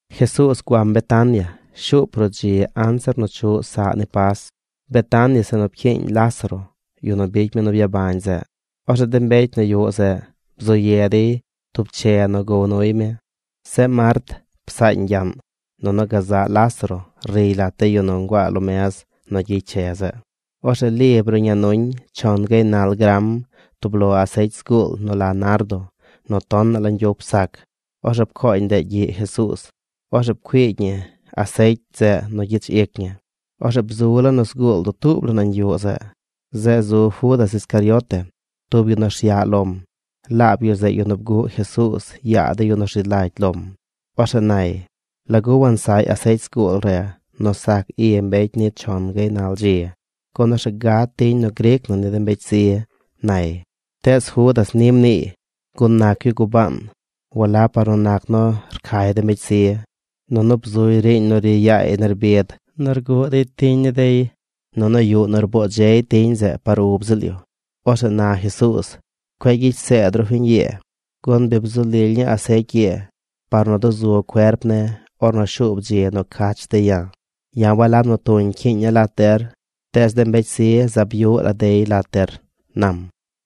Jesuuz guam Betania shuup ruꞌ dzi anzir nu chuꞌ saꞌ ni Pas. Betania zeꞌ nu pcyiiñ Lázaro, yu nu bicy mi nu byabañ zeꞌ. Orzeꞌ de mbecy nu yuꞌ zeꞌ bzu ye dey tub che nu gow nuy mi. Zeꞌ Mart psaañ gyaꞌn. Nunu gazaꞌ Lázaro riy lat de yu nu nguaa lo mez nu gyicy che zeꞌ. Orzeꞌ Li bruꞌña nuñ chon gaynal gram tub lo asecy zguul nu la nardo nu tonaꞌ la ñgyup sac. Orzeꞌ pcooñ ndeꞌ gyiꞌ Jesuuz. Orzeꞌ pcuiigy ñi asecy zeꞌ nu gyich ic ñi. Orzeꞌ bzu laa nu zguul dutuub la nañ yuꞌ zeꞌ. Zeꞌ zu Judas Iscariote, tub yu nu rsyaꞌ lom. Laab yu zeꞌ yu nu bguꞌ Jesuuz yaa de yu nu rzi lagy lom. Orzeꞌ nay: ―¿Lagu wansaꞌy asecy zguul re nu sac i mbecy ni chon gaynal dzi? Gun orzeꞌ gad tiñ nu gric na ni de mbecy zi ―nay. Tees Judas ni mniiy, gun nac yu gubaan walab par nu nac nu rcay de mbecy zi. Nunu bzuy riiñ nu ri yaay nerbid nu rguꞌ dey tiñ ni dey. Nunu yuꞌ nu rboo dzey tiñ zeꞌ par ub ziꞌl yu. Orzeꞌ na Jesuuz: ―Cueꞌ gyicy zeed ru fiñ ii, gun bi bzu lily ñii asecy ii par nu duzu cuerp ne̱ par ornu shuub dzi nu cach dey ya̱. Ya̱ walab nu tuñ cyiiña̱ lat der, tees de mbecy zi zaab yuꞌ la dey lat der ―nam.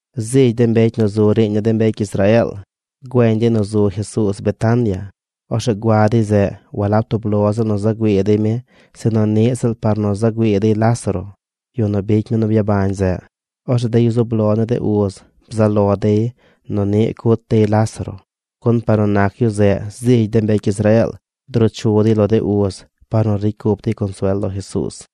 Zigy de mbecy nu zu riiñ ni de mbecy Israeel güeñ dey nu zu Jesuuz Betania. Orzeꞌ gua dey zeꞌ walab tub lo ziꞌl nu za güii dey mi sinu niꞌ ziꞌl par nu za güii dey Lázaro, yu nu bicy mi nu byabañ zeꞌ. Orzeꞌ de yu zub lo ni de uz bzaꞌ lo dey nu niꞌ cut dey Lázaro, gun par nu nac yu zeꞌ zigy de mbecy Israeel druu chu dey lo de uz par nu ricy cup dey consuel lo Jesuuz.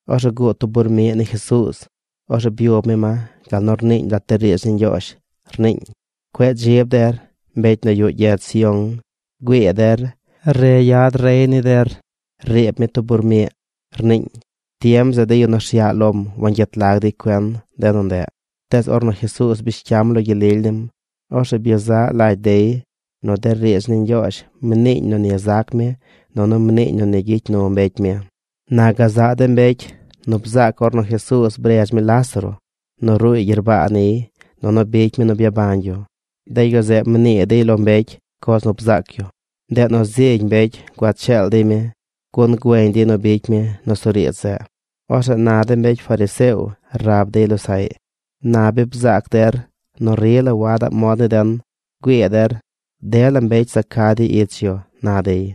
Orzeꞌ guud tub bur miꞌ ni Jesuuz. Orzeꞌ byub mi ma gal nu rniiñ lat de riidz ni Ñgyoozh. Rniiñ: Cueꞌ dzib der, mbecy nu yuꞌ gyedz Sión. Güii der. Re yad rey ni der. Riib mi tub bur miꞌ, rniiñ. Tiem zeꞌ de yu nu rsyaꞌ lom wangyet lag dey cuen de nu ndeꞌ. Tees ornu Jesuuz bish cyam lo gyel lily nim, orzeꞌ byezaꞌ lagy dey nu de riidz ni Ñgyoozh mniiñ nu ni zac mi nunu mniiñ nu ni gyicy nu mbecy mi. Na gazaꞌ de mbecy nu bzaac ornu Jesuuz bredz mi Lázaro nu ruuy gyerbaa niy nunu bicy mi nu byabañ yu, de yu zeꞌ mnii dey lo mbecy coz nu bzaac yu. Ndeꞌ nu zigy mbecy gua cheel dey mi, gun güeñ dey nu bicy mi nusuriidz zeꞌ. Orzeꞌ na de mbecy fariseo rab dey losaꞌy: ―Na bi bzaac der nu rila wadaꞌ mod ni den. Güii der. Dela mbecy za ca dey ich yu ―na dey.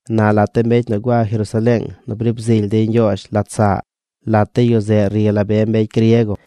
Na lat de mbecy nu gua Jerusaleeng nu briib zily dey Ñgyoozh lat saꞌ, lat de yu zeꞌ ri la be mbecy griego.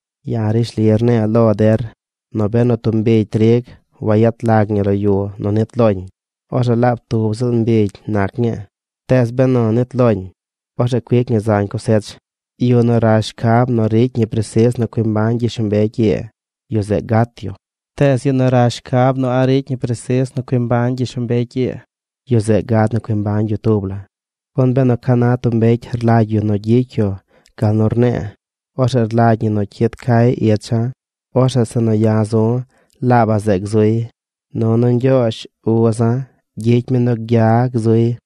Ya̱ rishli rne̱e̱ lo der nu benu tub mbigy trig wayet lag ñi lo yu nu nit loñ, orzeꞌ laab tub ziꞌl mbigy nac ñii. Tees benu nit loñ, orzeꞌ cuic ñi zañ cosech. Yu nu rash shcab nu ricy ñi presis nu cui mbañ gyishlombecy ii, yu zeꞌ gat yu. Tees yu nu rash shcab nu a̱ꞌ ricy ñi presis nu cui mbañ gyishlombecy ii, yu zeꞌ gad nu cui mbañ yu tub la. Gun benu ca na tub mbecy rlagy yu nu gyicy yu gal nu rne̱e̱, orzeꞌ rlagy ñi nu cyid cay icha̱. Orzeꞌ zeꞌ nu ya̱ zu̱, laabaꞌ zeꞌ gzuy. Nunu Ñgyoozh, uza̱, gyicy mi nu gya gzuy.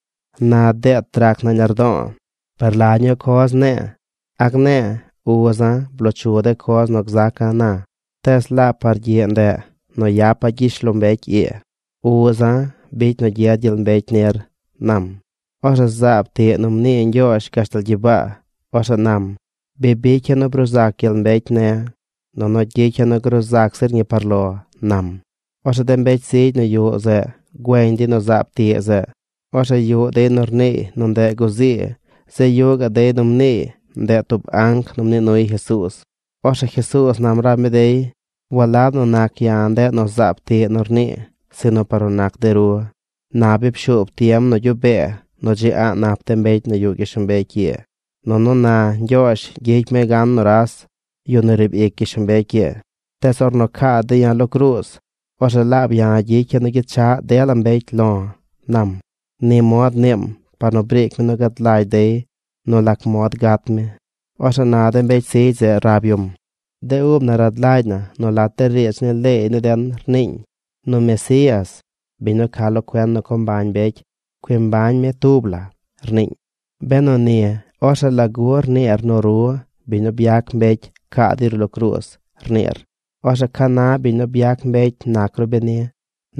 ’¡Na deet rac nañ lardo̱o̱! ¿Per la ñuu coz ne̱e̱? ¿A gne̱e̱: “Uza̱, bloo chu de coz nu gzaca̱ na”? ¡Tees laab par gyiꞌ ndeꞌ nu yapa̱ gyishlombecy ii! Uza̱ bicy nu gyed gyel mbecy nir ―nam. Orzeꞌ zaab tiꞌ nu mnii Ñgyoozh gashtal gyibaa. Orzeꞌ nam: ―Bi bicya̱ nu bruu zac gyel mbecy ne̱, nunu gyicya̱ nu gruu zac zir ñi par lo ―nam. Orzeꞌ de mbecy zigy nu yuꞌ zeꞌ güeñ dey nu zaab tiꞌ zeꞌ. Orzeꞌ yuꞌ dey nu rniiy nu ndeꞌ guzii. Zeꞌ yuꞌ gaꞌ dey nu mniiy nu ndeꞌ tub anc nu mnii nuy Jesuuz. Orzeꞌ Jesuuz nam rab mi dey: ―Walab nu nac ya̱ ndeꞌ nu zaab tiꞌ rnii sinu par nu nac de ru. Na bi pshuub tiem nu gyuꞌ bee nu dzi a̱ꞌ nap de mbecy nu yuꞌ gyishlombecy ii. Nunu na Ñgyoozh gyicy mi gan nuras, yu nu riib ic gyishlombecy ii. Tees ornu caa dey ya̱ lo cruuz, orzeꞌ laab ya̱ gyicya̱ nu gyechaꞌ dela mbecy lo̱ ―nam. Ni mod mniim par nu briic mi nu gad lagy dey nu lac mod gat mi. Orzeꞌ na de mbecy zigy zeꞌ rab yum: ―De ub na rad lagy na nu lat de riidz ni leey ni den rniiñ nu Mesías, biñ nu ca lo cuen nu co mbañ mbecy, cui mbañ mi tub la, rniiñ. Benu ni, orzeꞌ ¿lagu rniir nu ru, biñ nu byac mbecy, caa dey ru lo cruuz, rniir? Orzeꞌ ¿ca na biñ nu byac mbecy nac ru beni?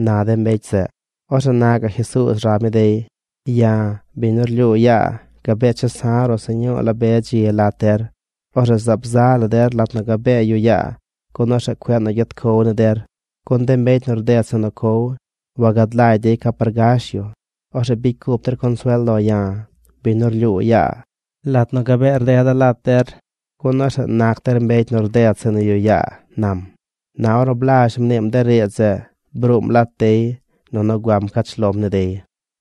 ―na de mbecy zeꞌ. Orzeꞌ na gaꞌ Jesuuz rab mi dey: ―Ya̱, biñ nu rlyuu yaa, gabee chesa̱ ru̱ꞌ sñuu la be dzi lat der. Orzeꞌ zaab za la der lat nu gabee yuꞌ yaa gun orzeꞌ cueꞌ gyet cow ni der. Gun de mbecy nu rded zeꞌ nu cow wagad lagy dey ca par gash yu. Orzeꞌ bicy cup der consuel lo ya̱, biñ nu rlyuu yaa, lat nu gabee rdeda̱ lat der, gun orzeꞌ nac der mbecy nu rded zeꞌ nu yuꞌ yaa ―nam. Na ornu blazh mniim de riidz zeꞌ, bruum lat dey nunu guam pcach lom ni dey.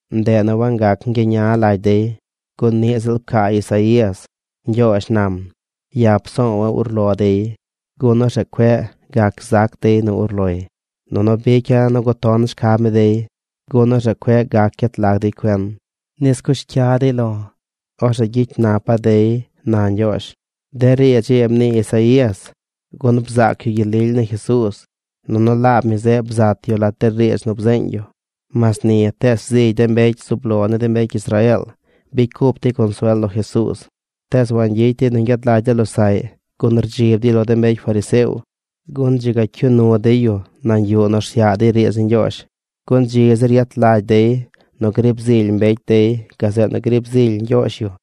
Ndeꞌ nu wangac ñgyeña lagy dey, gun niꞌ ziꞌl pcaa Isaías: Ñgyoozh nam: “Ya̱ psowa̱ urlo dey. Gun orzeꞌ cueꞌ gac zac dey nu urloy. Nunu bicya̱ nu guton shcab ni dey. Gun orzeꞌ cueꞌ gac gyet lag dey cuen, nis cush cya dey lo̱. Orzeꞌ gyicy napa̱ dey”, na Ñgyoozh. De riidz ii mnii Isaías gun bzaac yu gyel lily ni Jesuuz nunu laab mi zeꞌ bzat yu lat de riidz nu bzeeñ yu. Mas ni tees zigy de mbecy zub lo ni de mbecy Israeel bicy cup dey consuel lo Jesuuz. Tees wangyicy dey nu ñgyad lagy de losaꞌy gun rdzib dey lo de mbecy fariseo gun dzi ga cyuu nu dey yu nañ yuꞌ nu rsyaꞌ dey riidz ni Ñgyoozh. Gun dzi zir yet lagy dey nu grib zily mbecy dey gazeꞌ nu grib zily Ñgyoozh yu.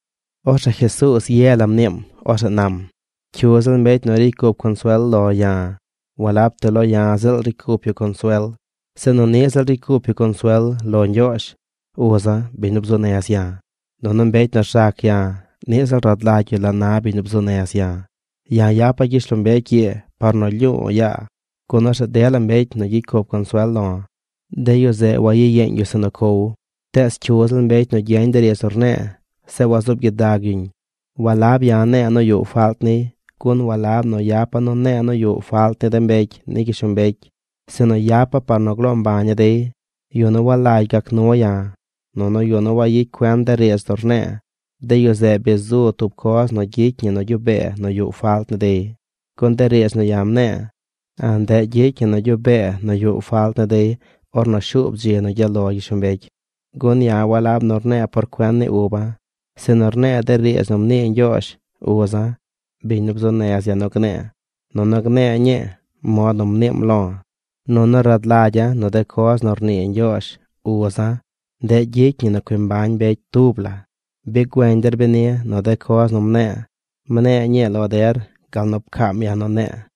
Orzeꞌ Jesuuz ye la mniim. Orzeꞌ nam: ―Cyu ziꞌl mbecy nu ricy cup consuel lo ya̱, walab ti lo ya̱ ziꞌl ricy cup yu consuel, sinu niꞌ ziꞌl ricy cup yu consuel lo Ñgyoozh, uza̱, biñ nu bzuu nez ya̱. Nunu mbecy nu rzac ya̱, niꞌ ziꞌl rad lagy yu la na biñ nu bzuu nez ya̱. Ya̱ yapa̱ gyishlombecy ii par nu lyu̱u̱ yaa, gun orzeꞌ dela mbecy nu gyicy cup consuel lo̱, de yu zeꞌ wagyiyeeñ yu zeꞌ nu cow. Tees cyu ziꞌl mbecy nu gyeñ de riidz nu rne̱e̱, zeꞌ wazuub gyidag yuñ, walab ya̱ ne̱e̱ nu yuꞌ falt niy. Gun walab nu yapa̱ nu ne̱e̱ nu yuꞌ falt ni de mbecy ni gyishlombecy, sinu yapa̱ par nu gloo mbaña̱ dey. Yu nu walagy gac nu ya̱, nunu yu nu wayicy cuen de riidz nu rne̱e̱, de yu zeꞌ bi zu tub coz nu gyicy ñi nu gyuꞌ bee nu yuꞌ falt ni dey. Gun de riidz nu ya̱ mne̱e̱, ndeꞌ gyicy ñi nu gyuꞌ bee nu yuꞌ falt ni dey ornu shuub dzi nu gyaꞌ lo gyishlombecy. Gun ya̱ walab nu rne̱e̱ por cuen ni uba̱, sinu rne̱e̱ de riidz nu mnii Ñgyoozh, uza̱, biñ nu bzuu nez ya̱ nu gne̱e̱, nunu gne̱e̱ ñii mod nu mniim lo̱. Nunu rad lagya̱ nu de coz nu rnii Ñgyoozh, uza̱, ndeꞌ gyicy ñi nu cui mbañ mbecy tub la. Bi güeñ der beni nu de coz nu mne̱e̱, mne̱e̱ ñii lo der gal nu pcaam ya̱ nu ne̱e̱.